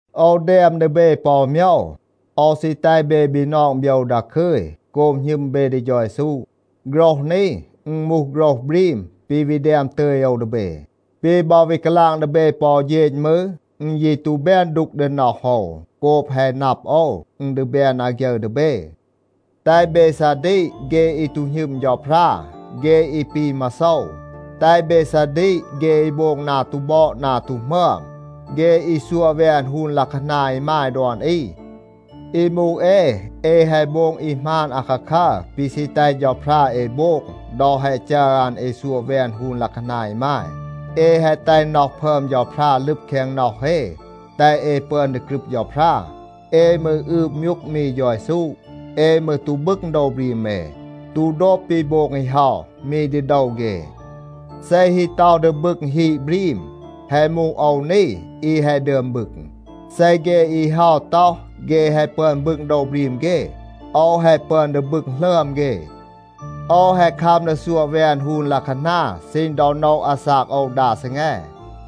โอว แดม ดี เบ ปอ อู โมยว. โอว ซี แตห เบ บีนอง โบยว ดาคึย โกบ หณึม เบ ดี เฌา เยซู. โฆรห นี อึณ มูห โฆรห บรีม ปี วี แดม ตึย โอว ดี เบ. ปี บอ วี กาลาง ดี เบ ปอ อู เฌณ มืร, อึณ ยี ตู แบน ดูก ดี น็อห โอว โกบ แฮะ นับ โอว, อึณ ดี แบน อาฆยึร ดี เบ. แตห เบ ซาดีก เฆ อี ตู หณึม เฌาพรา เฆ อี ปี มาโซว. แตห เบ ซาดีก เฆ อี โบง นา ตู บอด นา ตู หมึอม, เฆ อี ซัวะ แวน ฮูน ลัะคานา อีมาย ดอน อี. อี มูห เอ, เอ แฮะ โบง อี หมาน อาคาคัร ปี ซี แตห เฌาพรา เอ โบง ดอ แฮะ จัร อัน เอ ซัวะ แวน ฮูน ลัะคานา อีมาย. เอ แฮะ แตห น็อห พึอม เฌาพรา ลึบ แคง น็อห เอ, แตห เอ ปึอน ดี กรึบ เฌาพรา. เอ มืร อืบ มยูก มี เฌา เยซู. เอ มืร ตู บึง โดว บรีม เอ, ตู โดบ ปี โบง อี เฮา มี ดี โดว เฆ. เซ ฮี ต็อห ดี บึง ฮีด บรีม, แฮะ มูห โอว นี อี แฮะ ดึอม บึง. เซ เฆ อี เฮา ต็อห, เฆ แฮะ ปึอน บึง โดว บรีม เฆ, โอว แฮะ ปึอน ดี บึง หลึอม เฆ. โอว แฮะ คัม ดี ซัวะ แวน ฮูน ลัะคานา ซีณ ดอ โนะ อาซาก โอว ดา ซีแง.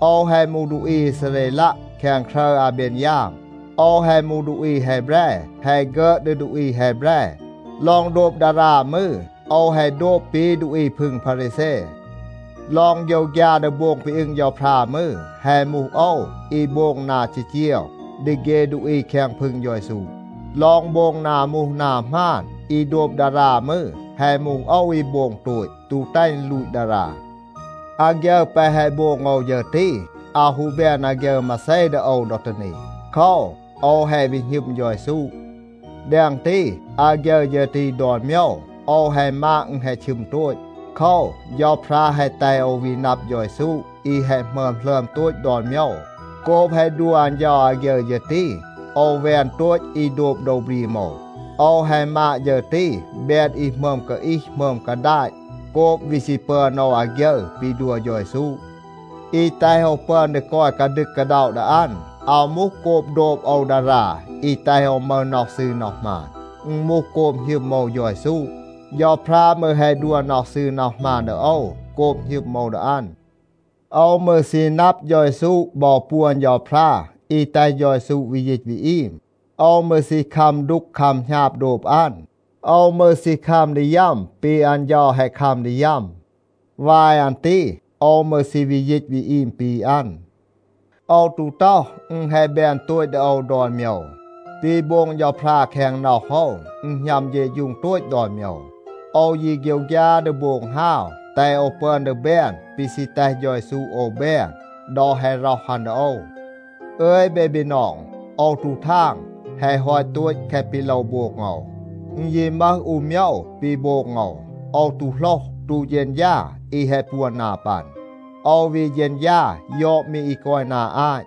โอว แฮะ มูห ดูอี อีซาเรลัะ แคง ครึร อาเบนยาม. โอว แฮะ มูห ดูอี แฮแบร, แฮะ ฆึอด ดี ดูอี แฮแบร. ลอง โดบ ดารา มืร, โอว แฮะ โดบ ปี ดูอี พึง พารีแซ. ลอง โฆยวฆยา ดี โบง ปี อึง เฌาพรา มืร, แฮะ มูห โอว อี โบง นา จีจีว ดี เฆ ดูอี แคง พึง เฌา เยซู. ลอง โบง นา มูห นา หมาน อี โดบ ดารา มืร, แฮะ มูห โอว อี โบง โตต, ตู แตห อึณ ลูต ดารา. อาฆยึร แปะ แฮะ โบง โอว ฌึร ตี, อาว ฮู แบน อาฆยึร มาเซ ดี โอว ดอ ตี นี. โคว, โอว แฮะ วี หณึม เฌา เยซู. แดง ตี, อาฆยึร ฌึร ตี ดอน โมยว, โอว แฮะ มาด อึณ แฮะ ชึม โตต. โคว, เฌาพรา แฮะ แตห โอว วี นับ เฌา เยซู อี แฮะ หมึอม หลึอม โตต ดอน โมยว. โกบ แฮะ ดัว อัน เฌา อาฆยึร ฌึร ตี, โอว แวน โตต อี โดบ โดว บรีม โอว. โอว แฮะ มาด ฌึร ตี แบน อี หมึอม กาอีห หมึอม กาดาต โกบ วี ซี ปึอน โอว อาฆยึร ปี ดัว เฌา เยซู. อี แตห โอว ปึอน ดี กอย กาดึก กาด็อะ ดี อัน, อาว มูห โกบ โดบ โอว ดารา อี แตห โอว มึห น็อห ซืร น็อห หมาน. อึณ มูห โกบ หณึม โอว เฌา เยซู. เฌาพรา มืร แฮะ ดัว น็อห ซืร น็อห หมาน ดี โอว โกบ หณึม โอว ดี อัน. โอว มืร ซี นับ เฌา เยซู บอ ปวน เฌาพรา อี แตห เฌา เยซู วี ยีต วี อีม. โอว มืร ซี คัม ดูก คัม หณาบ โดบ อัน. โอว มืร ซี คัม ดี ยัม ปี อัน เฌา แฮะ คัม ดี ยัม. วาย อัน ตี โอว มืร ซี วี ยีต วี อีม ปี อัน. โอว ตู ต็อห, อึณ แฮะ แบน โตต ดี โอว ดอน โมยว. ปี โบง เฌาพรา แคง น็อห โอว อึณ หณัม เฌะฌูง โตต ดอน โมยว. โอว ยี โฆยวฆยา ดี โบง ฮาว, แตห โอว ปึอน ดี แบน ปี ซี แตห เฌา เยซู โอว แบน ดอ แฮะ ร็อห อัน ดี โอว. อึย เบ บีนอง, โอว ตู ทาง แฮะ ฮอต โตต แคะ ปี โลว โบง โอว. อึณ ยี มึห อู โมยว ปี โบง โอว. โอว ตู โหลห, ตู เฌณฌา อี แฮะ ปวน นา ปัน. โอว วี เฌณฌา ยอด มี อี กอย นา อาต.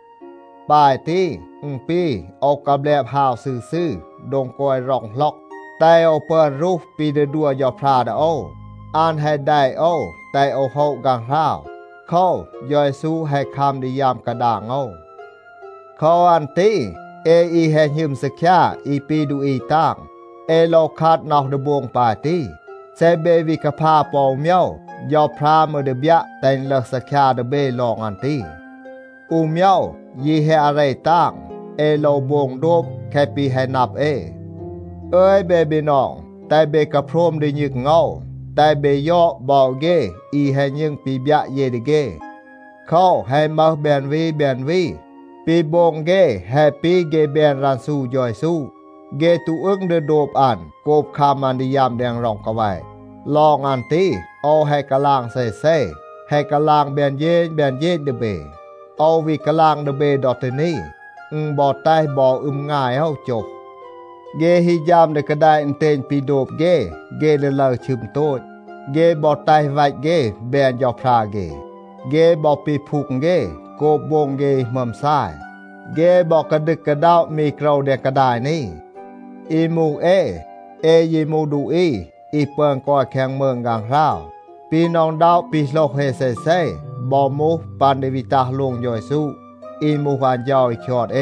ปาย ตี, อึณ ปี โอว กาแบลบ ฮาว ซืร ซืร โดง กอย ร็อง หล็อก, แตห โอว ปึอน รูห ปี ดี ดัว เฌาพรา ดี โอว. อัน แฮะ แดะ โอว, แตห โอว โฮะ ฆางหราว. โคว, เฌา เยซู แฮะ คัม ดี ยัม กาดาง โอว. โคว อัน ตี เอ อี แฮะ หณึม ซีคยา อี ปี ดูอี ตาง, เอ โลว คัด น็อห ดี โบง ปาย ตี. เซ เบ วี กาพา ปอ อู โมยว, เฌาพรา มืร ดี บยัะ แตห อึณ ลึห ซีคยา ดี เบ ลอง อัน ตี. อู โมยว ยี แฮะ อาเร ตาง. เอ โลว โบง โดบ แคะ ปี แฮะ นับ เอ. อึย เบ บีนอง, แตห เบ กาโพรม ดี ณึง โอว. แตห เบ ยอด บอ เฆ อี แฮะ ณึง ปี บยัะ เย ดี เฆ. โคว, แฮะ มึห แบน วี แบน วี, ปี โบง เฆ แฮะ ปี เฆ แบน รันซู เฌา เยซู. เฆ ตู อึง ดี โดบ อัน โกบ คัม อัน ดี ยัม แดง ร็อง กาแวะ. ลอง อัน ตี, โอว แฮะ กาลาง เซเซ, แฮะ กาลาง แบน เฌณ แบน เฌณ ดี เบ. โอว วี กาลาง ดี เบ ดอ ตี นี. อึณ บอ แตห บอ อึม งาย โอว โจห. เฆ ฮี ฌัม ดี กาแดะ อึณเตณ ปี โดบ เฆ, เฆ ดี ลึร ชึม โตต. เฆ บอ แตห วัต เฆ แบน เฌาพรา เฆ. เฆ บอ ปีพูง เฆ โกบ โบง เฆ อี หมึอม ซาย. เฆ บอ กาดึก กาด็อะ มี โกรว แดง กาดาย นี. อี มูห เอ, เอ ยี มูห ดูอี อี ปึอน กอย แคง มืง ฆางหราว. ปี หน็อะ อึณด็อะ ปี โหลห เอ เซเซ, บอ มูห ปัน ดี วี ตัห โลง เฌา เยซู อี มูห อัน เฌา อี คยอด เอ.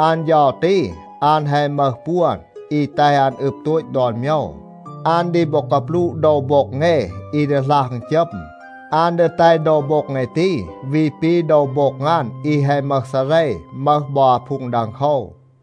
อัน เฌา ตี, อัน แฮะ มึห ปวน อี แตห อัน อึบ โตต ดอน โมยว. อัน ดี บอ กาปลูะ โดว โบ็ง เอ อี ดีหลัห อึณจัม. อัน ดี แตห โดว โบ็ง เอ ตี วี ปี โดว โบ็ง อัน อี แฮะ มึห ซาเร, มึห บอ อาพูง ดังโคว.